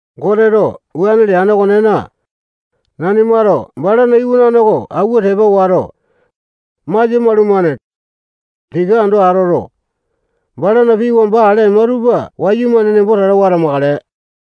Goteto wuane leane okonena, nanimato balana iwanane oko awua tepa wato, masia maulumane. Tika ando atoto, balana pii wamba ale ema tupa wayumane nemboto tatawa atamakale.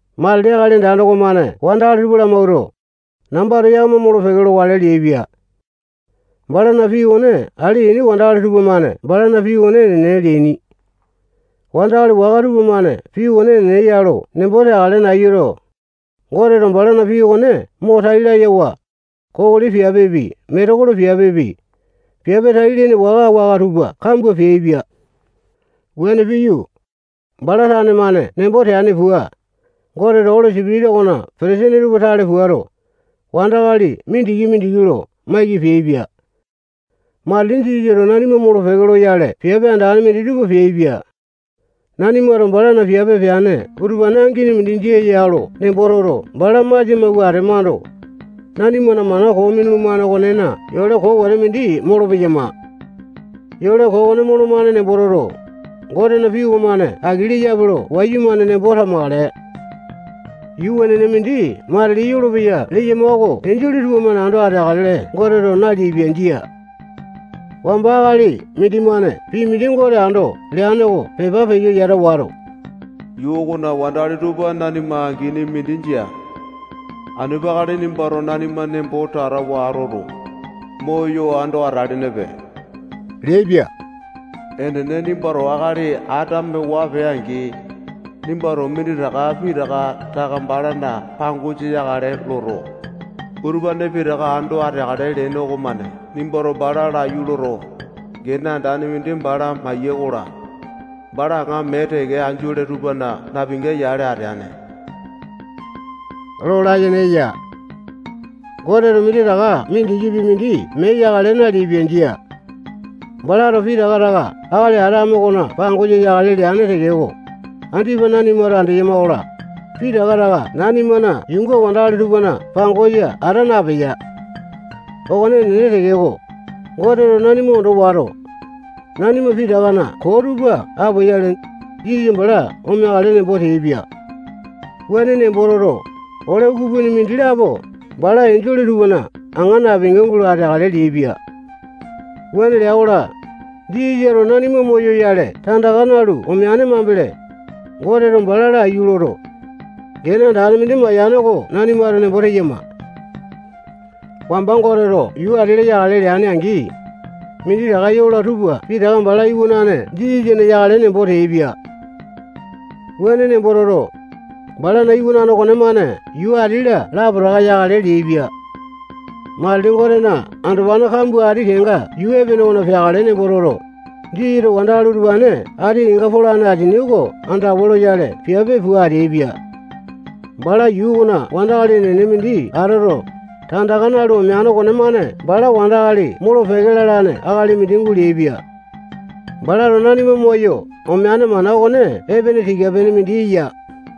Matili Akali Andane okomane wandakali tupa lamawuato, nambato yakama molo-peke lokale leaipia. Balana pii okone ale yaini wandakali tupamane balana pii okone enene leaini. Wandakali waka tupamane pii okone enene ya lo nembo teakale nayuto, Goteto balana pii okone mo tai layawa, kokoli piapepi, metekolo piapepi, piape tai-lene waka-waka tupa kambua peaipia. Wuane piyu, bala tane-mane nembo teane pua, Goteto Oli Sipitisa okona petesene tupa tale puato, wandakali mindiki-mindiki lo maiki peaipia. Matili Jisasato nanima molo-peke loyale piape andane minditupa peaipia. Nanimato balana piape peane utupane angini mindi jia ya lo nembo toto, bala masia mawua atemando, nanimana mana koo minulumane okonena yole koo wete mindi molopeyama. Yole koo okone molomane nembo toto, Gotena pii okomane aki leyape lo wayumane nembo tamakale. Yuu wenene mindi matili yolopeya leyama oko enjole tupamane ando ateakale Goteto naleaipia. Jia. Wamba akali mindimane pii mindi Gote ando leane oko pepa peyo yata wato, yuu okona wandakali tupa nanima angini mindi jia. Anu peakale nimbato nanima nembo tatawa atoto, moyo ando atalenepe leaipia. Enene, nimbato akali Atame waa pee-angi, nimbato minditaka pitaka taka balana pangosa yakale loto, balato utupane pitaka ando ateakale leene okomane nimbato bala laiyu loto, gene andane mindi bala maiyee-kola, bala aŋa mee teke enjole tupana napinga yale ateane lo layene eya. Goteto minditaka mindikipi mindi mee yakale naleaipia. Jia. Balato pitaka taka akali Atame okona pangosa yakale leane tekeko, andipa nanimato andeyama-kola, pitaka taka nanimana yuunga wandakali tupana pangosa ata napeya. Okone enene tekeko, Goteto nanima ondo wato, nanima pitakana koo tupa apoyale, Jisasa bala omeakale nembo teaipia. Wuane nembo toto, ole ukupini mindilapo bala enjole tupana aŋa napinga gulo ateakale leaipia. Wuane lea-kola, Jisasato nanima moyoyale tandaka nalu omeane mambele, Goteto bala laiyu loto, gene andane mindi mayane oko nanimato nembo teyama. Wamba Goteto yuu ati-la yakale leane-angi, minditaka yola tupa pitaka bala Iwanane Jisasana yakale nembo teaipia. Wuane nembo toto, balana iwanane okonemane yuu ati-la okolapo yakale leaipia. Matili Gotena andopane kambua ati kenga yuu epene okona peakale nembo toto, Jisasato wandakali utupane ati kenga polane asini oko andawa loyale piape pua ateaipia. Bala yuu okona wandakali enene mindi atoto, tandaka nalu omeane okonemane bala wandakali molo-peke lalane akali mindi guleaipia. Balato nanima moyo omeane mana okone epene tika-pene mindi eya.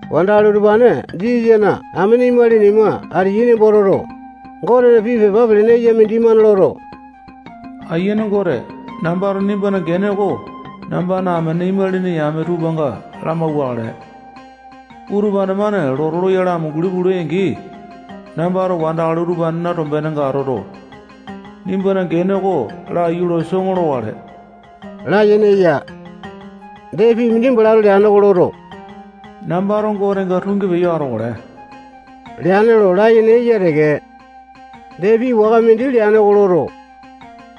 Wandakali utupane Jisasana amene imalini ima ateyai nembo toto, Gotena pii pepa pelene eya mindimane loto, Aiyane Gote, nambato nimbana gene oko nambana amene imalini yame tupanga lamauwakale. Utupane-mane lotu loyale amunguli pula-angi, nambato wandakali utupanena tombenenga atoto, nimbana gene oko laiyu lo soŋo lokale layene eya. Dee, pii mindi balato leane oko loto, nambato Gotenga tungi peyo atokale leane lo layene eya teke. Dee, pii waka mindi leane oko loto,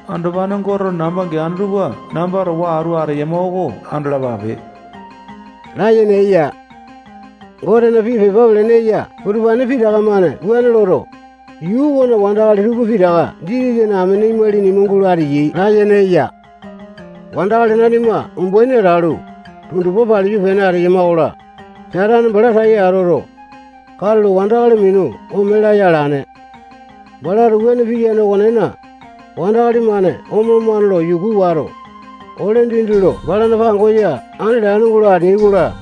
andopane Goteto namba geane tupa namba towa atu ateyama oko andalapape layene eya. Gotena pii pepa pelene eya utupane pitaka-mane wuane loto, yuu okona wandakali tupa pitaka Jisasana amene imalini ima gulo ateyai layene eya. Wandakali nanima umbaini atalu, tundupa paliyu pene ateyama-kola, Satane bala tai atoto, katulo wandakali minu ome laya alane. Balato wuane piyane okonena, wandakali-mane omolomane lo yuku wato, ole dindi lo balana pangosa andi latane gulo ateai-kola,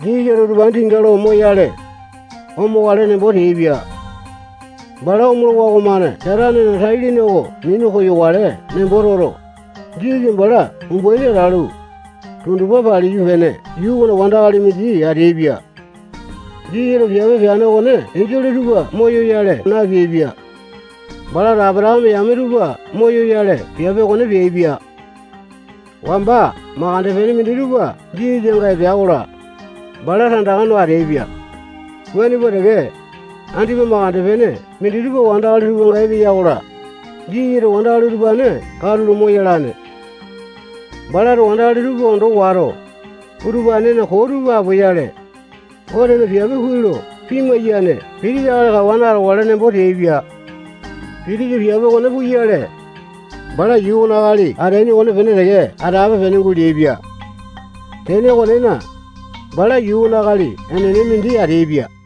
Jisasato utupane tinga lo moyale, omokale nembo teaipia. Bala omolowa okomane Satanena tai-lene oko minu koyokale nembo toto, Jisasa bala umbaini atalu, tundupa paliyu pene yuu okona wandakali mindi ateaipia. Jisasato piape peane okone enjole tupa moyoyale napeaipia. Balato Apatakame yame tupa moyoyale piape okone peaipia. Wamba mandeke pene minditupa Jisasanga epea-kola, bala tandaka no ateaipia. Wuane pua teke, andipa mandeke pene minditupa wandakali tupanga epeya-kola, Jisasato wandakali utupane katulo moyalane. Balato wandakali tupa ondo wato, utupanena koo tupa apoyale, Gotena piape kuai lo pimai-yane pitisa akali kawane atokale nembo teaipia. Pitisa piape okone puyale, bala yuu okona akali ateaini okonepene teke atape-pene guleaipia. Tene okonena, bala yuu okona akali enene mindi ateaipia.